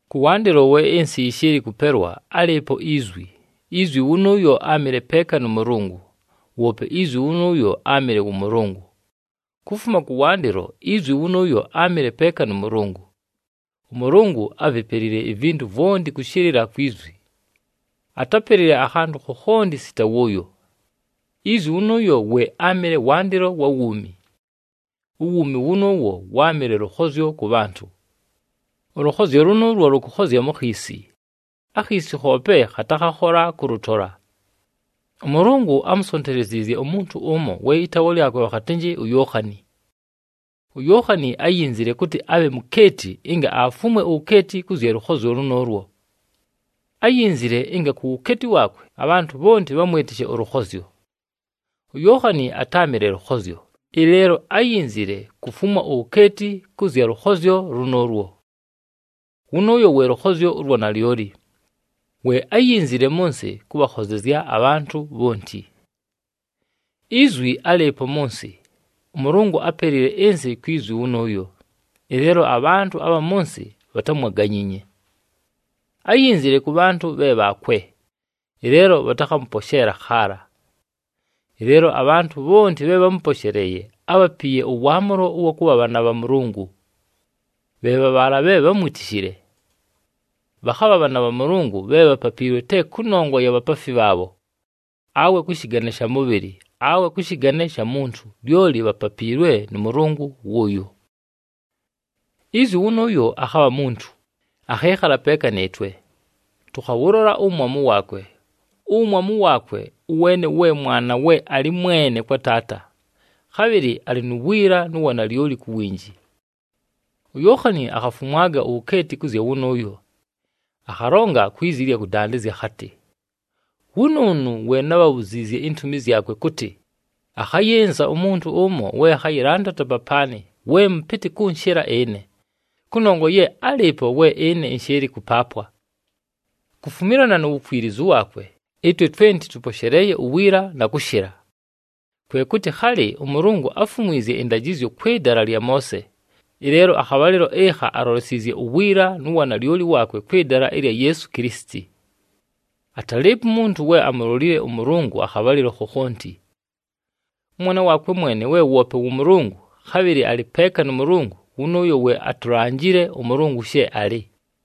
Kʉwandɨlo we ɨnsɨ yɨshɨɨlɨ kʉpelwa, álɨɨpo iZwi. IZwi wʉnʉʉyo áamɨle peeka nʉ Mʉlʉngʉ. Woope iZwi wʉnʉʉyo áamɨle wʉ Mʉlʉngʉ. Kufuma kʉwandɨlo iZwi wʉnʉʉyo áamɨle peeka nʉ Mʉlʉngʉ. ɄMʉlʉngʉ ávipelile ivintu vwonti kʉshɨlɨla kwi Zwi. Atápelile akhantʉ khokhonti sita wʉʉyo. IZwi wʉnʉʉyo we áamɨle wandɨlo wa wuumi. Uwuumi wʉnʉʉwo wáamɨle lʉkhozyo kʉ bhantʉ. Ʉlʉkhozyo lʉnʉʉlwo lʉkʉkhozya mu khiisi, akhiisi khoope khatakhakhola kʉlʉtola. ɄMʉlʉngʉ ámusonteleziizye umuntu ʉmo we ɨtaawa lyakwe bhakhatɨnjɨ uYookhani. UYookhani áyinzile kʉtɨ abhe mukeeti ɨnga afumwe uwukeeti kʉ zya lʉkhozyo lʉnʉʉlwo. Áyinzile ɨnga ku wukeeti waakwe abhantʉ bhonti bhamwɨtɨshe ʉlʉkhozyo. UYookhani atáamɨle lʉkhozyo, ɨleelo áyinzile kufumwa uwukeeti kʉ zya lʉkhozyo lʉnʉʉlwo. Wʉnʉʉyo we lʉkhozyo ʉlwa nalyoli, we áyinzile mʉ nsɨ kʉbhakhozezya abhantʉ bhonti. Izwi álɨɨpo mʉ nsɨ. ɄMʉlʉngʉ ápelile ɨnsɨ kwi Zwi wʉnʉʉyo, ɨleelo abhantʉ abha mʉ nsɨ bhatámwaganyiinye. Áyinzile kʉ bhantʉ bhe bhaakwe, ɨleelo bhatakhamʉposheela khaala. Ɨleelo abhantʉ bhonti bhe bhámʉposheleeye ábhapiiye ʉwaamʉlo ʉwa kʉbha bhaana bha Mʉlʉngʉ, bhe bha bhaala bhe bhámwitishile. Bhakhabha bhaana bha Mʉlʉngʉ bhe bhapapiilwe te kʉnongwa ya bhapaafi bhaabho, awe kʉ shɨgane sha mʉbhɨlɨ, awe kʉ shɨgane sha muntu, lyoli bhapapiilwe nʉ Mʉlʉngʉ wʉʉyo. Izwi wʉnʉʉyo akhabha muntu, akhɨɨkhala peeka nɨɨtwe. Tʉkhawʉlola uwumwamu waakwe, uwumwamu waakwe ʉweene we Mwana we alɨ mwene kwa Taata, khabhɨlɨ alɨ nu wiila nu wanalyoli ku winji. UYookhani akhafumwaga uwukeeti kʉ zya wʉnʉʉyo, akhalonga kwi zi ɨlya kʉdandɨzya akhatɨ, “Wʉnʉʉnʉ we nábhabhuziizye intumi zyakwe kʉtɨ, ‘Akhayɨnza umuntu ʉmo we akhayɨlandata papaanɨ we mʉpɨtɨ kʉnshɨla ɨne, kʉnongwa ye álɨɨpo we ɨne ɨnshɨɨlɨ kʉpaapwa.’” Kufumilana nu wukwilizu waakwe, ɨtwe twenti tʉposheleeye uwiila na kʉshɨla. Kwe kʉtɨ khalɨ ʉMʉlʉngʉ áfumwizye ɨndajɨzyo kwɨ dala lya Moose, ɨleelo akhabhalɨlo ɨkha alolesiizye uwiila nu wanalyoli waakwe kwɨ dala ɨlya Yeesu Kilisiti. Atalɨɨpo umuntu we amulolile ʉMʉlʉngʉ akhabhalɨlo khokhonti. ɄMwana waakwe mwene, we woope wʉ Mʉlʉngʉ, khabhɨlɨ alɨ peeka nʉ Mʉlʉngʉ, wʉnʉʉyo we atulanjile ʉMʉlʉngʉ she alɨ.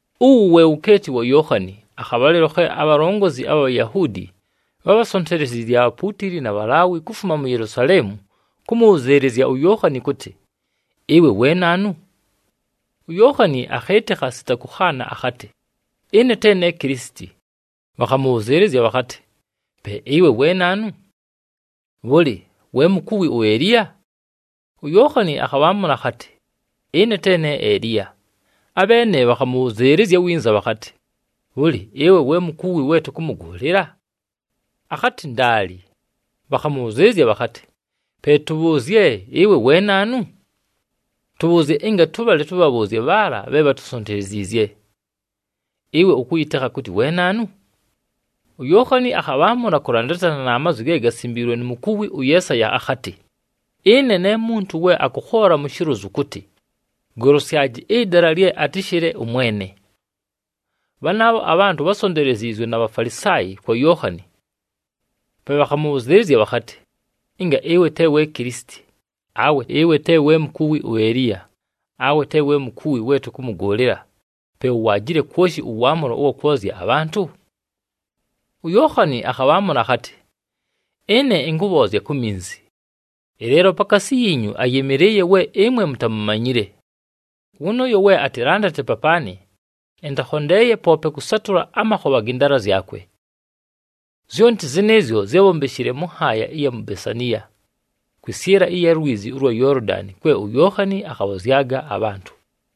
Uwu we wukeeti wa Yookhani, akhabhalɨlo khe abhalongozi abha Bhayahuudi bhábhasonteleziizye abhapuutili na Bhalaawi kufuma mu Yelusaleemu kʉmʉbhʉzɨɨlɨzya uYookhani kʉtɨ, “Ɨwe we naanu?” UYookhani akhɨɨtɨkha sita kʉkhaana akhatɨ, “Ɨne te ne Kilisiti.” Bhakhamʉbhʉzɨɨlɨzya bhakhatɨ, “Pe ɨwe we naanu? Bhʉlɨ, we mukuwi uEliya?” UYookhani akhabhaamʉla akhatɨ, “Ɨne te ne Eliya.” Abheene bhakhamʉbhʉzɨɨlɨzya winza bhakhatɨ, “Bhʉlɨ, ɨwe we mukuwi we tʉkʉmʉgʉʉlɨla?” Akhatɨ, “Ndaali.” Bhakhamʉbhʉzɨɨlɨzya bhakhatɨ, “Pe tʉbhʉʉzye, ɨwe we naanu? Tʉbhʉʉzye ɨnga tʉbhale tʉbhabhʉʉzye bhaala bhe bhatusonteleziizye. Ɨwe ʉkʉyɨtekha kʉtɨ we naanu?” UYookhani akhabhaamʉla kʉlandatana na mazwi ge gasimbiilwe nu mukuwi ʉYeesaya, akhatɨ, “Ɨne ne muntu we akʉkhoola mu shilozu kʉtɨ, ‘Golosyaji ɨdala lye atɨshɨle ʉMwene.’” Bhanaabho abhantʉ bhásonteleziizwe na Bhafalisaayi kwa Yookhani. Pe bhakhamʉbhʉzɨɨlɨzya bhakhatɨ, “Ɨnga ɨwe te we Kilisiti, awe ɨwe te we mukuwi uEliya, awe te we mukuwi we tʉkʉmʉgʉʉlɨla, pe uwaajile kwoshi ʉwaamʉlo ʉwa kwozya abhantʉ?” UYookhani akhabhaamʉla akhatɨ, “Ɨne ɨnkʉbhoozya ku minzi, ɨleelo pakaasi yiinyu ayɨmɨlɨɨye we ɨmwe mutamumanyile. Wʉnʉʉyo we atɨlandate papaanɨ, ɨntakhondeeye poope kʉsatʉla amakhobha gɨ ndaala zyakwe.” Zyonti zɨnɨɨzyo zyábhombeshile mʉ nhaaya ɨya mu Besaniya, kwɨsyɨla ɨlya lwizi ʉlwa Yoolodani kwe uYookhani akhabhozyaga abhantʉ.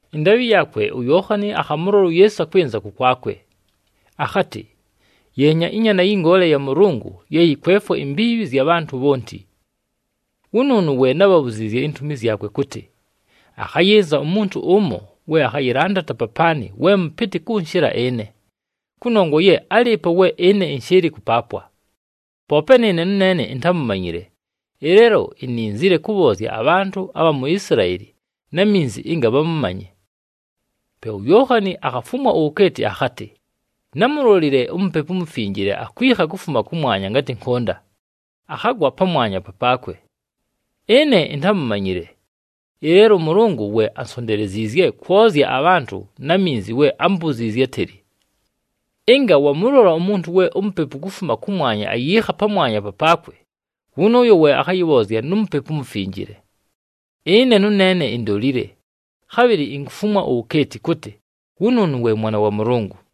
Ɨndaabhɨ yaakwe, uYookhani akhamʉlola uYeesu akwɨnza kʉkwakwe. Akhatɨ, “Yeenya, ɨNyaana yɨ Ngoole ya Mʉlʉngʉ ye yɨkwefwa imbiibhi ɨzya bhantʉ bhonti! Wʉnʉʉnʉ we nábhabhuziizye intumi zyakwe kʉtɨ, ‘Akhayɨnza umuntu ʉmo we akhayɨlandata papaanɨ we mʉpɨtɨ kʉnshɨla ɨne, kʉnongwa ye álɨɨpo we ɨne ɨnshɨɨlɨ kʉpaapwa.’ Poope nɨɨne nʉneene intámumanyile, ɨleelo ininzile kʉbhoozya abhantʉ abha mu Isilaeli na minzi ɨnga bhamʉmanye.” Pe uYookhani akhafumwa uwukeeti akhatɨ, “Námulolile uMupepu uMufinjile akwikha kufuma kʉmwanya ngatɨ nkʉnda, akhagwa pamwanya papaakwe. Ɨne intámumanyile, ɨleelo ʉMʉlʉngʉ we ansonteleziizye kwozya abhantʉ na minzi we ámbuziizye átɨlɨ, ‘Ɨnga wamʉlola umuntu we uMupepu kufuma kʉmwanya ayiikha pamwanya papaakwe, wʉnʉʉyo we akhayɨbhoozya nu Mupepu uMufinjile.’ Ɨne nʉneene indolile, khabhɨlɨ inkufumwa uwukeeti kʉtɨ wʉnʉʉnʉ we Mwana wa Mʉlʉngʉ.”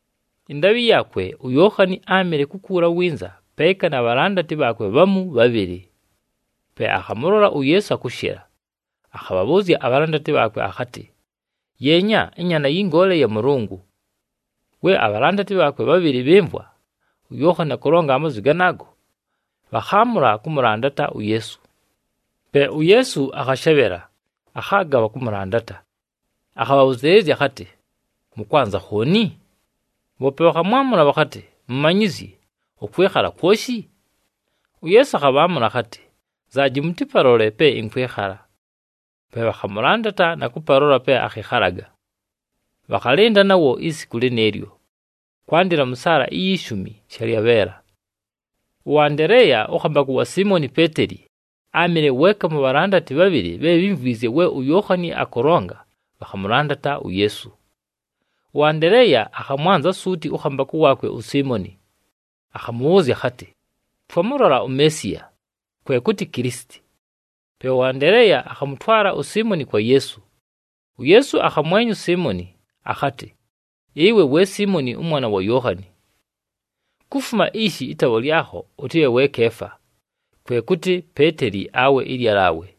Ɨndaabhɨ yaakwe, uYookhani áamɨle kukuula winza peeka na bhalandati bhaakwe bhamu bhabhɨlɨ. Pe akhamʉlola uYeesu akʉshɨla, akhabhabhʉʉzya abhalandati bhaakwe akhatɨ, “Yeenya, ɨNyaana yɨ Ngoole ya Mʉlʉngʉ!” We abhalandati bhaakwe bhabhɨlɨ bhɨmvwa uYookhani akʉlonga amazwi ganaago, bhakhaamʉla kʉmʉlandata uYeesu. Pe uYeesu akhashebhela, akhaaga bhakʉmʉlandata. Akhabhabhʉzɨɨlɨzya akhatɨ, “Mʉkwanza khooni?” Bhoope bhakhamwamʉla bhakhatɨ, “Mumanyizyi, ʉkwɨkhala kwoshi?” UYeesu akhabhaamʉla akhatɨ, “Nzaaji, mʉtɨpalole pe ɨnkwɨkhala.” Pe bhakhamʉlandata na kʉpalola pe akhɨkhalaga. Bhakhalɨnda nawo isiku lɨnɨɨlyo, kwandɨla mʉ saala iyi shumi shalyabheela. ɄAndeleeya, ʉkhambakʉ wa Siimoni Peeteli, áamɨle weeka mu bhalandati bhabhɨlɨ bhe bhímvwizye we uYookhani akʉlonga, bhakhamʉlandata uYeesu. ɄAndeleeya akhamwanza suuti ʉkhambakʉ waakwe uSiimoni. Akhamʉbhʉʉzya akhatɨ, “Twamʉlola uMeesiya!” kwe kʉtɨ Kilisiti. Pe ʉAndeleeya akhamʉtwala uSiimoni kwa Yeesu. UYeesu akhamwenya uSiimoni, akhatɨ, “Ɨwe we Siimoni ʉmwana wa Yookhani. Kufuma ishi, ɨtaawa lyakho ʉtɨbhe we Keefa,” kwe kʉtɨ Peeteli awe ɨLyalaawe.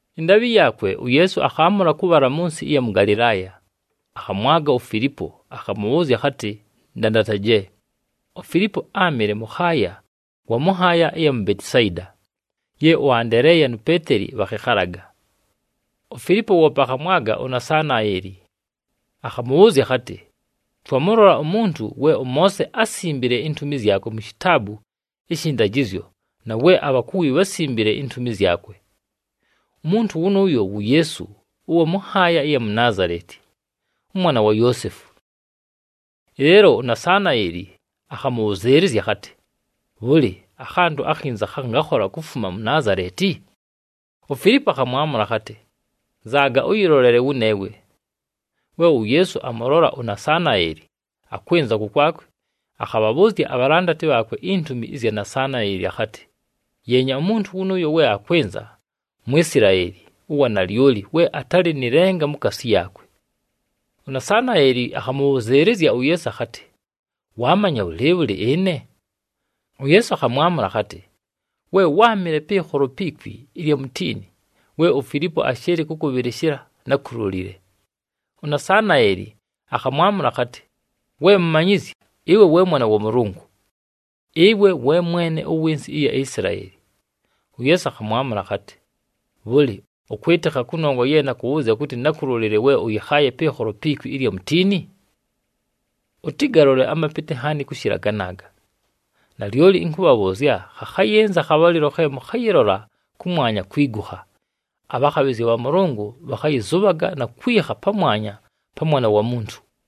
Ɨndaabhɨ yaakwe, uYeesu akhaamʉla kʉbhala mʉ nsɨ ɨya mʉ Galɨlaaya. Akhamwaga uFilipo, akhamʉbhʉʉzya akhatɨ, “Ndandataje.” UFilipo áamɨle mʉkhaaya wa mʉ nhaaya ɨya mu Betisayida ye ʉAndeleeya nu Peeteli bhakhɨkhalaga. UFilipo woope akhamwaga uNasanaeli, akhamʉbhʉʉzya akhatɨ, “Twamʉlola umuntu we ʉMoose ásimbile intumi zyakwe mu Shitaabu ɨshɨ ndajɨzyo na we abhakuwi bhásimbile intumi zyakwe. Umuntu wʉnʉʉyo wu Yeesu ʉwa mʉ nhaaya ɨya mu Naazaleti, ʉmwana wa Yoosefu.” Ɨleelo uNasanaeli akhabhʉzɨɨlɨzya akhatɨ, “Bhʉlɨ, akhantʉ akhinza khangakhola kufuma mu Naazaleti?” UFilipo akhamwamʉla akhatɨ, “Nzaaga ʉyɨlolele wʉneewe.” We uYeesu amʉlola uNasanaeli akwɨnza kʉkwakwe, akhabhabhʉʉzya abhalandati bhaakwe intumi zya Nasanaeli akhatɨ, “Yeenya, umuntu wʉnʉʉyo we akwɨnza, Mwisilaeli ʉwa nalyoli we atalɨ nɨ lenga mukaasi yaakwe.” UNasanaeli akhamʉbhʉzɨɨlɨzya uYeesu akhatɨ, “Waamanya bhʉlɨɨbhʉlɨ ɨne?” UYeesu akhamwamʉla akhatɨ, “We wáamɨle pɨɨkholo pi kwi ɨlya mutiini, we uFilipo ashɨɨlɨ kʉkʉbhɨlɨshɨla nákulolile.” UNasanaeli akhamwamʉla akhatɨ, “We Mumanyizyi, ɨwe we Mwana wa Mʉlʉngʉ! Ɨwe we Mwene ʉwɨ nsɨ ɨya Isilaeli!” UYeesu akhamwamʉla akhatɨ, “Bhʉlɨ, ʉkwɨtɨkha kʉnongwa ye nakʉbhʉʉzya kʉtɨ nákulolile we ʉyɨkhaaye pɨɨkholo pi kwi ɨlya mutiini? Ʉtɨgalole amapɨtɨ nhaani kʉshɨla ganaaga! Nalyoli ɨnkʉbhabhʉʉzya, khakhayɨnza akhabhalɨlo khe mʉkhayɨlola kʉmwanya kwigukha, abhakhabhɨzya bha Mʉlʉngʉ bhakhayɨzʉbhaga na kwikha pamwanya pa mwa Mwana wa Muntu.”